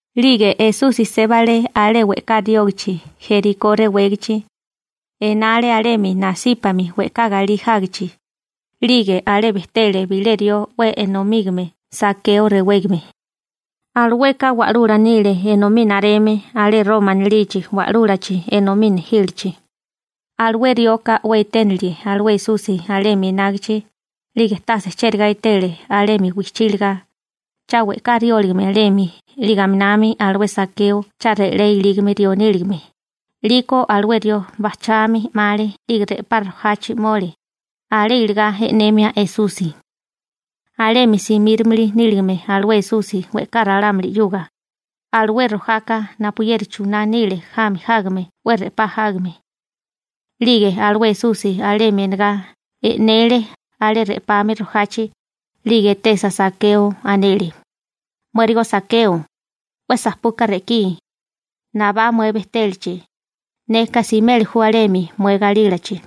'Lige Esusi sébale alé we'ká riógachi Jerikó rewégachi. Enale alemi nasípami we'ká galí jágichi. 'Lige alé bejtele bilé rió 'we enomígame Sakeo rewégame. Alueka wa'lula nile enomí nareme alé Roma anilichi wa'lúlachi enomí nejílichi. Alué rioka 'we eténile alué Esusi alemi enágichi, 'lige tase chérigá etele alemi wijchí iligá, cha we'ká rióligame alemi 'lige aminami alué Sakeo cha re'lé ilígame rió níligame. 'Liko alué rió bajchami 'male 'lige re'pá rojachi 'mole, alé iligá e'nemia Esusi. Alemi simírimili níligame alué Esusi we'ká ralámuli 'yuga. Alué rojaka napuyeri chuná nile jami jágame 'we re'pá jágame. 'Lige alué Esusi alemi enegá, e'nele alé re'pami rojachi, 'lige etesa Sakeo anele: ―Muérigo Sakeo, 'we sapuka re'kí, nabá mué bejtélachi, neka simeli ju alemi mué galílachi.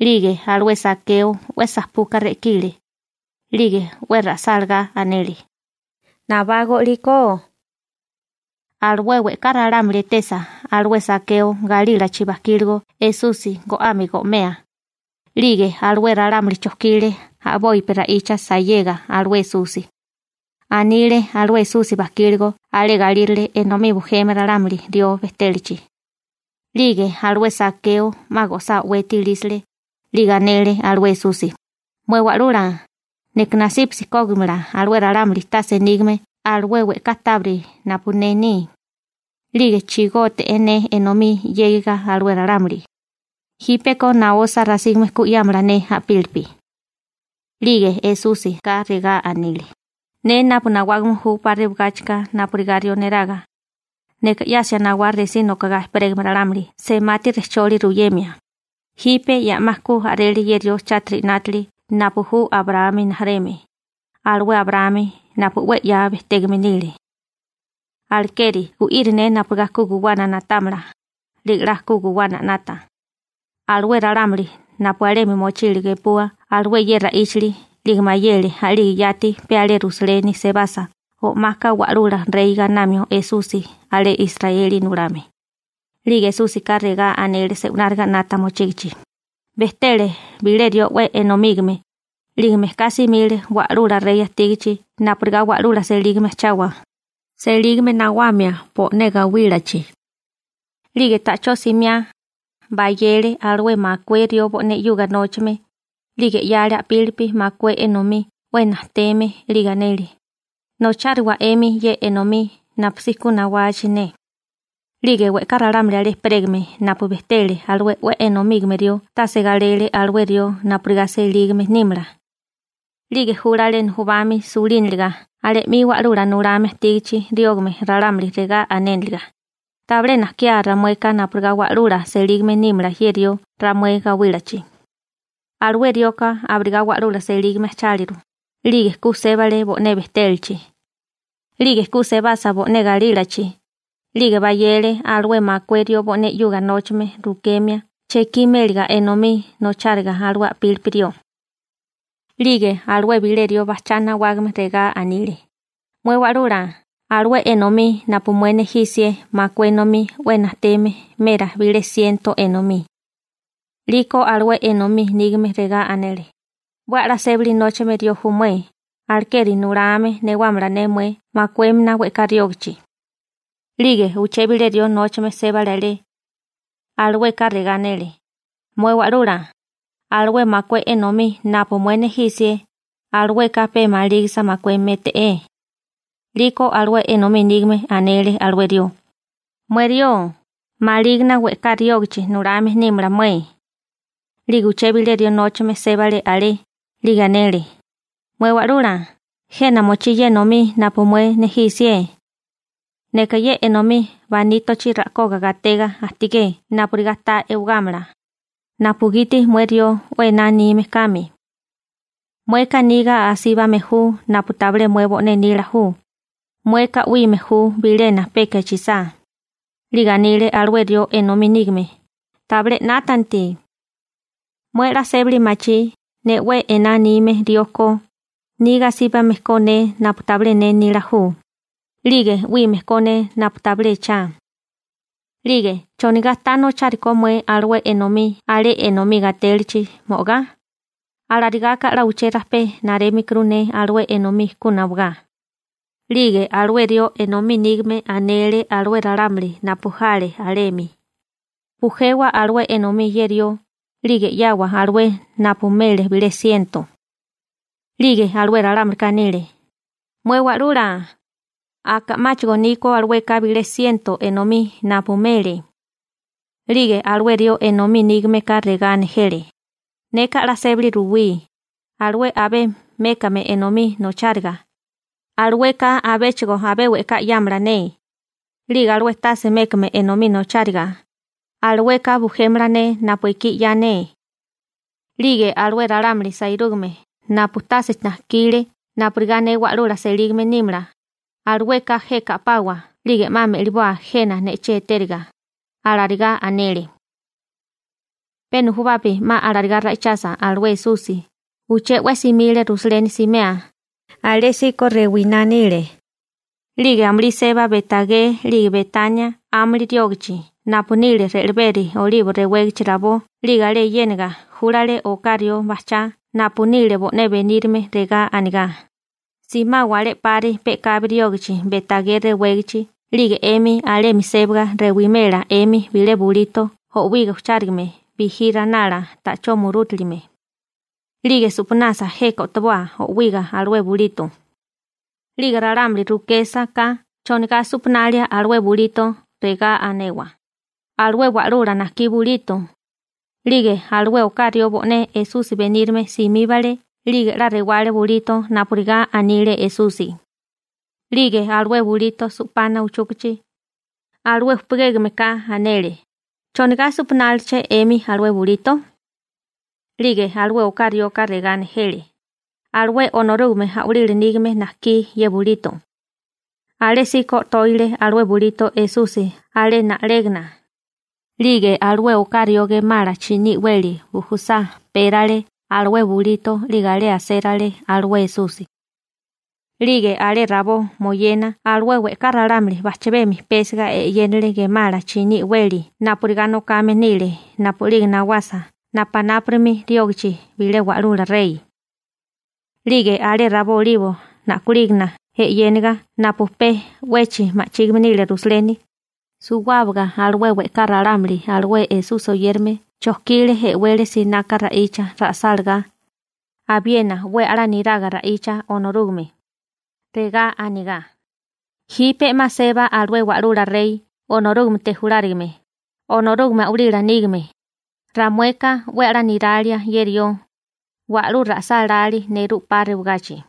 'Lige alué Sakeo 'we sapuka re'kile, 'lige 'we ra'sálagá anele: ―Nabágó 'liko. Alué we'ká ralámuli etesa alué Sakeo galílachi bajkigó Esusi go'ame go'mea, 'lige alué ralámuli chojkile a'bopi ra'icha sayega alué Esusi. Anile alué Esusi bajkíligo alé galírale enomí bujeme ralámuli rió bejtélachi. 'Lige alué Sakeo 'ma go'sá o'weti ilísale, 'lige anele alué Esusi: ―Mué Wa'lula, neka nasípasi kógimala alué ralámuli tase nígame alué we'ká tábiri napu ne ni, 'lige chigógite'é ne enomí 'yégiga alué ralámuli, jípeko naosa rasígame ku 'yámala ne a'pílipi. 'Lige Esúsika regá anile: ―Ne napu nawágame ju 'pa rewagáchika napurigá rió neraga, neka 'yasia nawá resí nokagá ejperégame ralámuli semati rejcholi ruyemia, jipe ya 'ma ku a'rele ye rió chátiri 'nátili napu ju Abraámi rijimala, alué Abraámi napu 'we 'ya bejtégame nile. Alekeri gu'iri ne napurigá ku guwana na'támala, 'lige 'la ku guwana 'nata. Alué ralámuli napu alemi mochile gepua alué ye ra'íchali, 'lige mayele a'lige yati pe alé Rusaleni sebasa o'maka Wa'lula Rey gainamio Esusi alé Israeli nulame. 'Lige Esúsika regá anele se'wináriga 'nata mochígichi: ―Bejtele bilé rió 'we enomígame, 'lige mejká simile wa'lula rey ajtígachi napurigá wa'lula selígame ajchawa, selígame nawamia bo'né gawílachi. 'Lige ta'chó simiá, bayele alué makué rió bo'né 'yuga nóchame, 'lige 'yale a'pílipi makué enomí 'we najteme 'lige anele: «Nocháriwa 'emi ye enomí napusí ku nawachi ne.» › 'Lige we'ká ralámuli alé ejperégame napu bejtele alué 'we enomígame rió tase galele alué rió napurigá selígame nímala, 'lige júlale nujubami sulíniliga alé 'mi wa'lula nulame ajtígachi riógame ralámuli regá anéniliga: «Tabilé najkiá ramueka napurigá wa'lula selígame nímala ye rió ramué gawílachi.» › Alué rioka abirigá wa'lula selígame ajcháliru, 'lige ku sébale bo'né bejtélachi. 'Lige ku sebasa bo'né galílachi, 'lige bayele alué makué rió bo'né 'yuga nóchame rukemia chekí méliga enomí nocháriga alué a'pílipi rió. › 'Lige alué bilé rió bajchá nawágame regá anile: «Mué Wa'lula, alué enomí napu mué nejí 'sié makué enomí 'we najteme merá bilé siento enomí.» › 'Liko alué enomí nígame regá anele: «'We a'lá sébali nóchame rió ju mué, alekeri nulame newámala ne mué makuémina we'ká riógachi.» › 'Lige uché bilé rió nóchame sébale alé. Alueka regá anele: «Mué Wa'lula, alué makué enomí napu mué nejí 'sié, alueka pe malígisa makué méte'é.» › 'Liko alué enomí nígame anele alué rió: «Mué rió, malígina we'ká riógachi nulame nímala mué.» › 'Lige uché bilé rió nóchame sébale alé, 'lige anele: «Mué Wa'lula, jena mochí ye enomí napu mué nejí 'sié. Neka ye enomí banítochi ra'koga gatega ajtigé napurigá ta e'wagámala, napugiti mué rió 'we ená anime kame. Mueka niga asíbame ju napu tabilé mué bo'né nila ju, mueka 'wíime ju bilena peka echisá.» › 'Lige anile alué rió enomí nígame: «Tabilé 'nátanti. Mué 'la sébali machí ne 'we ená anime rió ko, niga asíbame ko ne napu tabilé ne nila ju, 'lige 'wíime ko ne napu tabilé echá. 'Lige ¿chonigá ta nochari ko mué alué enomí alé enomí gatélachi mo'ogá? Alarigaka 'la uché rajpé narémikuru ne alué enomí ku nawagá.» › 'Lige alué rió enomí nígame anele alué ralámuli napu jale alemi: «Bujewa alué enomí ye rió, 'lige 'yawa alué napu mele bilé siento.» › 'Lige alué ralámulika anile: «¡Mué Wa'lula, aka 'máchigo ni ko alueka bilé siento enomí napu mele!» › 'Lige alué rió enomí nígameka regá nejele: «Neka 'la sébali ruwí, alué abé mékame enomí nocháriga, alueka abéchigo abé we'ká 'yámala ne. 'Lige alué tase mékame enomí nocháriga, alueka bujémala ne napu ekí 'ya ne. 'Lige alué ralámuli sairúgame napu tase najkile napurigá ne wa'lula selígame nímala, alueka jeka a'pawa 'lige 'ma me'liboa jena ne'chí etériga», alarigá anele. Pe nujubapi 'ma alarigá ra'ichasa alué Esusi, uché 'we simile Rusaleni simea, alésíko rewiná nile. 'Lige amulí seba Be'tagé 'lige Betania 'ámuli riógachi napu nile re'leberi Olibo rewégachi rabó 'lige alé yéniga júlale oká rió bajchá napu nile bo'né benírime, regá anigá: ―Simawa alé 'pari pe'kabi riógachi Be'tagé rewégachi 'lige 'emi alemi sébaga rewimela 'emi bilé bulito o'wiga ujchárigame bijí ranala ta'chó murútilime. 'Lige su'panasa jeka o'toboa o'wiga alué bulito. 'Lige ralámuli rukésaká chonigá su'panalia alué bulito, regá anewa: «Alué Wa'lula najkí bulito.» 'Lige alué oká rió bo'né Esusi benírame simíbale 'lige 'la rewale bulito napurigá anile Esusi. 'Lige alué bulito su'pana uchúkachi, alué upugégame ka anele: ―¿Chonigá su'panáliché 'emi alué bulito? 'Lige alué oká rioka regá nejele: ―Alué Onorúgame a'walila nígame najkí ye bulito. Alésíko o'tóile alué bulito Esusi alé na'légana, 'lige alué oká rió gemala chiní i'weli bujusá pérale alué bulito 'lige alé asérale alué Esusi. 'Lige alé rabó moyena alué we'ká ralámuli bajchabemi pésiga e'yénale gemala chiní i'weli napurigá nokame nile napu'lige nawasa napunápuri riógachi bilé wa'lula rey. 'Lige alé rabó Olibo na'kolígana e'yéniga napu pe 'wechi ma'chígime nile Rusaleni, suwábaga alué we'ká ralámuli alué Esusi oyérame chojkile e'wele sinaka ra'icha ra'sálagá, abiena 'we a'lá niraga ra'icha Onorúgame. Regá anigá: ―¡Jipe 'ma seba alué Wa'lula Rey Onorúgamete julárigame, Onorúgame a'walila nígame, ramueka 'we a'lá niralia ye rió! ¡Wa'lú ra'sálalí nerú 'pa rewagachi!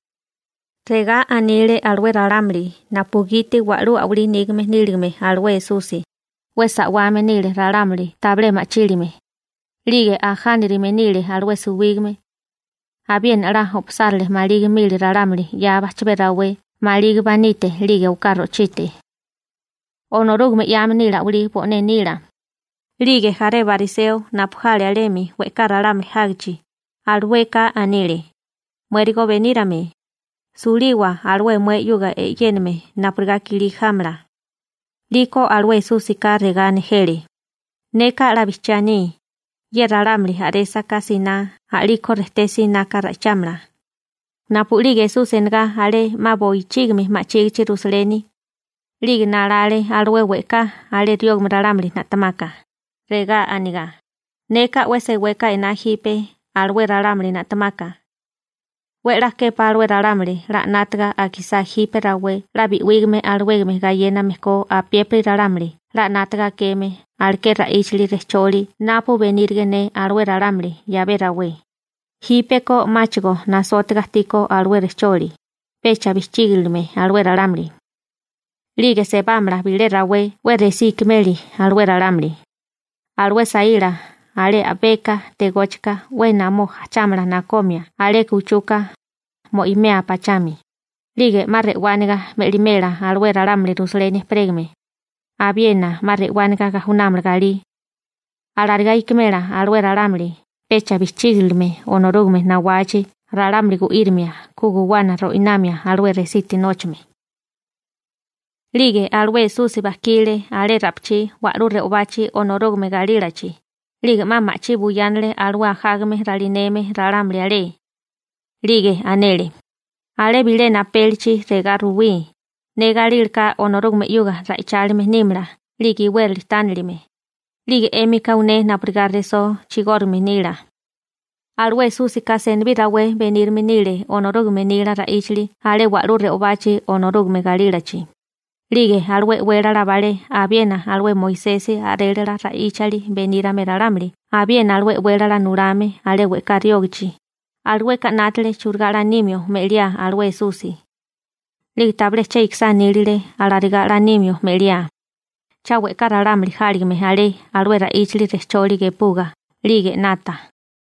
Regá anile alué ralámuli napugiti wa'lú a'walí nígame níligame alué Esusi, 'we sa'wame nile ralámuli tabilé ma'chílime, 'lige ajánarime nile alué suwígame. Abiena 'la o'pasárale maligi mili ralámuli 'ya bajchabé rawé maligi banite 'lige oká ro'chite. Onorúgame 'yame nile a'walí bo'né nila. 'Lige jaré bariseo napu jale alemi we'ká ralámuli jágichi, alueka anile: ―Muérigo benírame, suliwa alué mué 'yuga e'yéname napurigá kilí jámala. 'Liko alué Esúsika regá nejele: ―Neka 'la bijchiá aní, ye ralámuli a'résaká siná a'liko rejté sinaka ra'ichámala. Napu'lige Esusi enagá alé 'ma bochígimi ma'chígichi Rusaleni, 'lige nalale alué we'ká alé riógame ralámuli na'temaka, regá anigá: ―Neka 'we seweka ená jipe alué ralámuli na'temaka. 'We 'la képá alué ralámuli 'la 'nátaga akisá jipe rawé 'la bi'wígame alawégame gayéname ko apiépiri ralámuli 'la 'nátaga akeme aleké ra'íchali rejcholi napu benírige ne alué ralámuli 'yabé rawé, jípeko 'máchigo nasótiga ajtíkó alué rejcholi, pecha bijchígilime alué ralámuli. 'Lige sebámala bilé rawé 'we resí ikimeli alué ralámuli. Alué saíla alé a'beka tegóchika we'é namó ajchámala nakomia aleka uchuka, mo'imea pachami, 'lige 'ma re'wániga me'limela alué ralámuli Rusaleni ejperégame, abiena 'ma re'wániga gajunámala galí. Alarigá ikimela alué ralámuli pecha bijchígiligame Onorúgame nawachi ralámuli gu'írimia ku guwana ro'inamia alué resiti nóchame. 'Lige alué Esusi bajkile alé ra'pichí wa'lú re'obachi Onorúgame galílachi, 'lige 'ma ma'chí buyánale alué ajágame ralineme ralámuli alé. 'Lige anele: ―Alé bilena apélichi regá ruwí: «Ne galílaká Onorúgame 'yuga ra'ichálime nímala 'lige iwérali tánilime», 'lige 'émika uné napurigá resó chigórigame nila. Alué Esúsika senibí rawé benírime nile Onorúgame nila ra'íchali alé wa'lú re'obachi Onorúgame galílachi, 'lige alué e'wélala balé abiena alué Moisesi a'rélala ra'íchali benírame ralámuli abiena alué e'wélala nulame alé we'ká riógachi, alueka 'nátale churigá 'la nimio me'liá alué Esusi. 'Lige tabilé che ikisá nílile alarigá 'la nímio me'liá, cha we'ká ralámuli jáligame alé alué ra'íchali rejcholi gepuga 'lige 'nata.